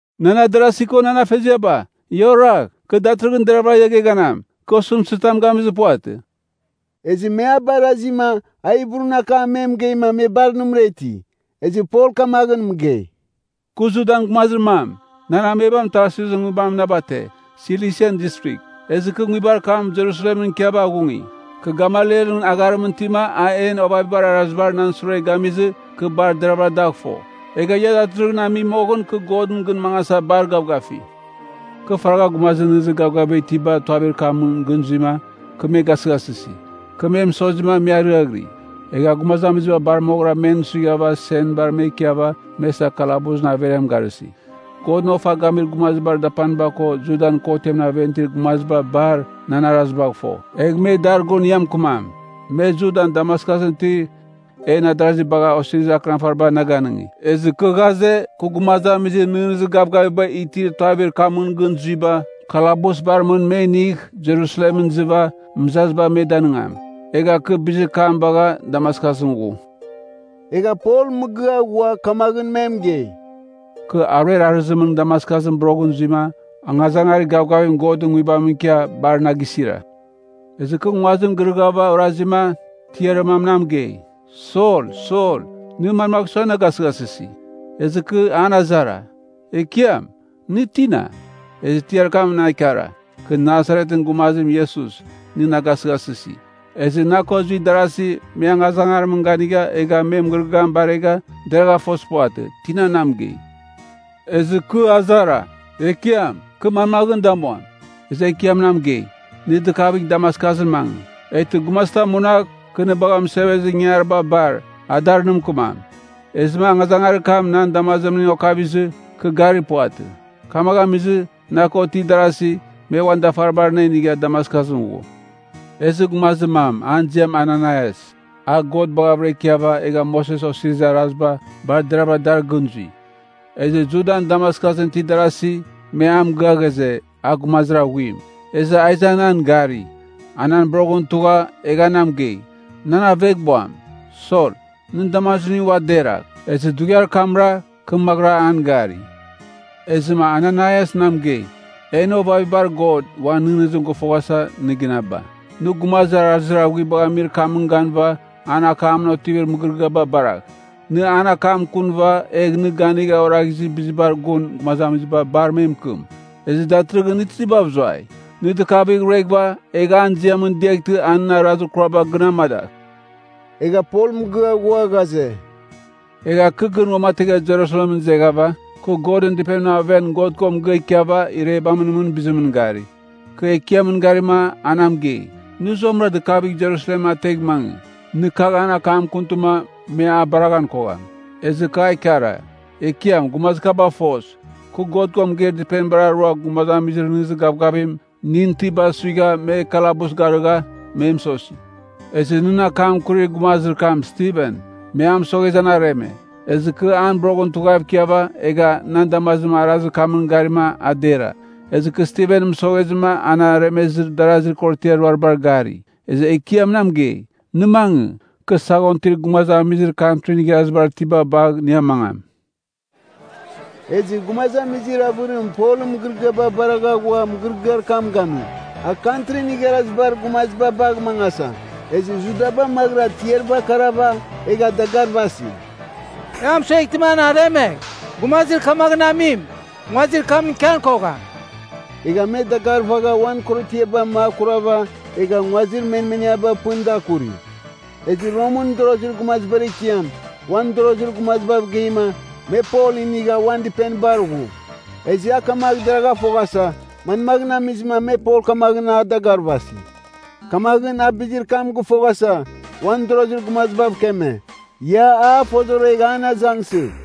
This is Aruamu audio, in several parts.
“Nan adarasi ko nan afeziaba, ia oragh. Kɨ datɨrɨghɨn deravɨra ia geghanam. Kɨ osɨmtɨzitam gamizir puvatɨ.” Ezɨ me a barazima, a Hibrun akam me mɨgeima, me bar nɨmɨra iti. Ezɨ Pol kamaghɨn mɨgei, “Kɨ Judan gumazir mam, nan amebam Tarsusɨn nguibamɨn na bate, Silisian Distrigh. Ezɨ kɨ nguibar kam Jerusalemɨn ikiava aghungi. Kɨ Gamalielɨn agharimɨn itima a en ovavibar arazibar nan sure gamizɨ, kɨ bar deravɨra dagh fo. Egha ia datɨrɨghɨn ami moghɨn kɨ Godɨn gɨn mangasa bar gavgafi. Kɨ faragha gumazir nɨghnɨzir gavgaviba itiba Tuavir Kamɨn gɨn zuima, kɨ me gasɨghasɨsi. Kɨ me mɨsozima me ariaghɨri. Egha gumazamiziba bar moghɨra men suighava senbar me ikiava me isa kalabusɨn averiam garɨsi. Godɨn ofa gamir gumazibar dapanim ko Judan kotɨn aven itir gumaziba bar nan arazibagh fo, egh me dar gun ia mɨkɨmam. Me Judan Damaskusɨn itir en darazi bagha osirizir akɨnafariba na ganɨngi. Ezɨ kɨ ghaze, kɨ gumazamizir nɨghnɨzir gavgaviba itir Tuavir Kamɨn gɨn zuiba, kalabusbar mɨn me inigh Jerusalemɨn izɨva, mɨzaziba me danɨngam. Egha kɨ bizir kam bagha Damaskusɨn ghu.” Egha Pol mɨgɨa ghua kamaghɨn me mɨgei, “Kɨ aruer arɨzimɨn Damaskusɨn boroghɨra zuima, angazangarir gavgavim Godɨn nguibam ikia bar na gisira. Ezɨ kɨ nguazim girɨghava orazima, tiarir mam na mɨgei, ‘Sol! Sol! Nɨ manmagh sua na gasɨghasɨsi?’ “Ezɨ kɨ an azara, ‘Ekiam, nɨ tina?’ “Ezɨ tiarir kam na ikara, ‘Kɨ Nasaretɨn gumazim Iesus, nɨ na gasɨghasɨsi.’ Ezɨ na ko zuir darasi, me angazangarimɨn ganigha, egha me mɨgɨrɨgɨam baragha deragha fozir puvatɨ, tina na mɨgei. “Ezɨ kɨ azara, ‘Ekiam, kɨ manmaghɨn damuam?’ “Ezɨ Ekiam na mɨgei, ‘Nɨ dɨkavighɨva Damaskusɨn mangɨ. Eghtɨ gumazitam munagh, kɨ nɨ bagha mɨsevezir ingangariba bar, a dar nɨ mɨkɨmam.’ Ezɨma angazangarir kam nan damazimning okavizɨ, kɨ garir puvatɨ. Kamaghɨn amizɨma na ko itir darasi me uan dafaribar na inigha Damaskusɨn ghu. “Ezɨ gumazir mam, an ziam Ananaias, a God baghavɨra ikiava, egha Moses Osirizir Araziba bar deraghavɨra dar gɨn zui. Ezɨ Judan Damaskusɨn itir darasi, me a mɨgɨa ghaze, a gumazir aghuim. Ezɨ a iza nan gari. A nan boroghɨn tugha, egha mɨgei, ‘Nan aveghbuam, Sol, nɨn damazimning ua deragh.’ Ezɨ dughiar kamra, kɨ maghɨra an gari. “Ezɨma Ananaias na mɨgei, ‘En ovavibar God uan nɨghnɨzim gɨfoghasa nɨ ginaba. Nɨ Gumazir arazir aghuibagh amir kamɨn ganɨva, an akamɨn otivir mɨgɨrɨgɨaba baragh. Nɨ an akam akunɨva, egh nɨ ganigha oraghizir bizibar gun gumazamiziba bar me mɨkɨmam. Ezɨ datɨrɨghɨn nɨ tizibav zuai? Nɨ dɨkavigh rueghɨva, egh an ziamɨn diaghtɨma a nɨn arazir kuraba gɨn amadagh.’” Egha Pol mɨgɨa ghua ghaze, “Egha kɨ gɨn uamategha Jerusalemɨn izeghava, kɨ Godɨn Dɨpenimɨn aven God ko mɨgɨa ikiava irebamɨn mɨn bizimɨn gari. Kɨ Ekiamɨn garima a na mɨgei, ‘Nɨ zuamɨra dɨkavighɨva Jerusalem ategh mangɨ. Nɨ kagh nan akam akuntɨma, me a bareghan kogham.’ “Ezɨ kɨ a ikara, ‘Ekiam, gumazir kabagh foz, kɨ God ko mɨgeir dɨpenibar arua gumazamizir nɨghnɨzir gavgavim nɨn itiba suigha me kalabus garɨgha, me mɨsosi. Ezɨ nɨn akam akurir gumazir kam Stiven, me a mɨsoghezɨ an areme. Ezɨ kɨ an boroghɨn tughav ikiava, egha nan damazim arazir kamɨn garima a dera. Ezɨ kɨ Stiven mɨsoghezɨma an aremezir darazir korotiar ruaribar gari.’ “Ezɨ Ekiam na mɨgei, ‘Nɨ mangɨ. Kɨ saghon itir gumazamizir Kantrin Igharazibar Itiba bagh nɨ amangam.’” Ezɨ gumazamizir avɨrim Polɨn mɨgɨrɨgɨaba baragha ghua mɨgɨrɨgɨar kam gami, a Kantrin Igharazibar Gumaziba bagh mangasa. Ezɨ Judaba maghɨra tiariba akarava, egha dagarvasi, “E a mɨsueghtɨma an aremegh! Gumazir kamaghɨn amim nguazimɨn ikian kogham.” Egha me dagarvagha uan korotiaba makurava egha nguazir mɨnemniaba pɨn da akuri. Ezɨ Romɨn mɨdorozir gumazibar ekiam, uan mɨdorozir gumazibav geima, me Pol inigha uan dɨpenibar ghu. Ezɨ a kamagh deragh foghasa, manmaghɨn amizɨma me Pol kamaghɨn a dagarvasi. Kamaghɨn a bizir kam gɨfoghasa, uan mɨdorozir gumazibav keme, ia a fozoregh an azangsɨgh.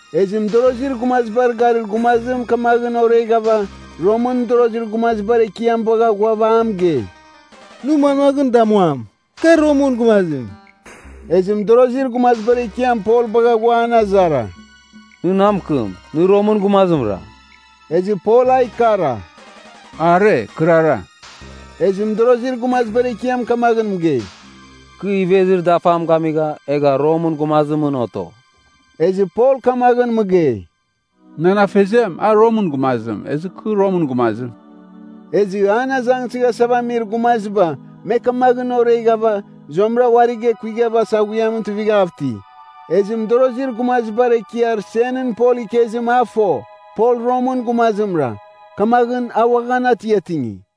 Ezɨ mɨdorozir gumazibar garir gumazim kamaghɨn oreghava, Romɨn mɨdorozir gumazibar ekiam bagha ghuava a mɨgei, “Nɨ manmaghɨn damuam? Kar Romɨn gumazim.” Ezɨ mɨdorozir gumazibar ekiam Pol bagha ghua an azara, “Nɨ na mɨkɨm, nɨ Romɨn gumazimra?” Ezɨ Pol a ikara, “Are, kɨrara.” Ezɨ mɨdorozir gumazibar ekiam kamaghɨn mɨgei, “Kɨ ivezir dafam gamigha, egha Romɨn gumazimɨn oto.” Ezɨ Pol kamaghɨn mɨgei, “Nan afeziam, a Romɨn gumazim, ezɨ kɨ Romɨn gumazim.” Ezɨ an azangsɨghasava amir gumaziba me kamaghɨn oreghava, zuamɨra uarigh ekuigha saghuiamɨn tuivighav iti. Ezɨ mɨdorozir gumazibar ekiar senɨn Pol ikezim a fo, Pol Romɨn gumazimra. Kamaghɨn a uaghan atiatingi.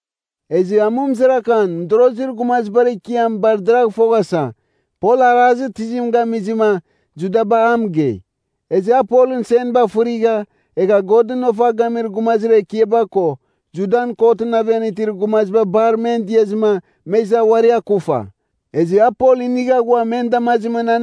Ezɨ amɨmzarakan mɨdorozir gumazibar ekiam bar deragh foghasa, Pol arazir tizim gamizɨma, Judaba a mɨgei. Ezɨ a Polɨn senba fɨrigha, egha Godɨn ofa gamir gumazir ekiaba ko Judan kotɨn aven itir gumaziba bar men diazɨma me iza uari akufa. Ezɨ a Pol inigha ghua men damazimɨn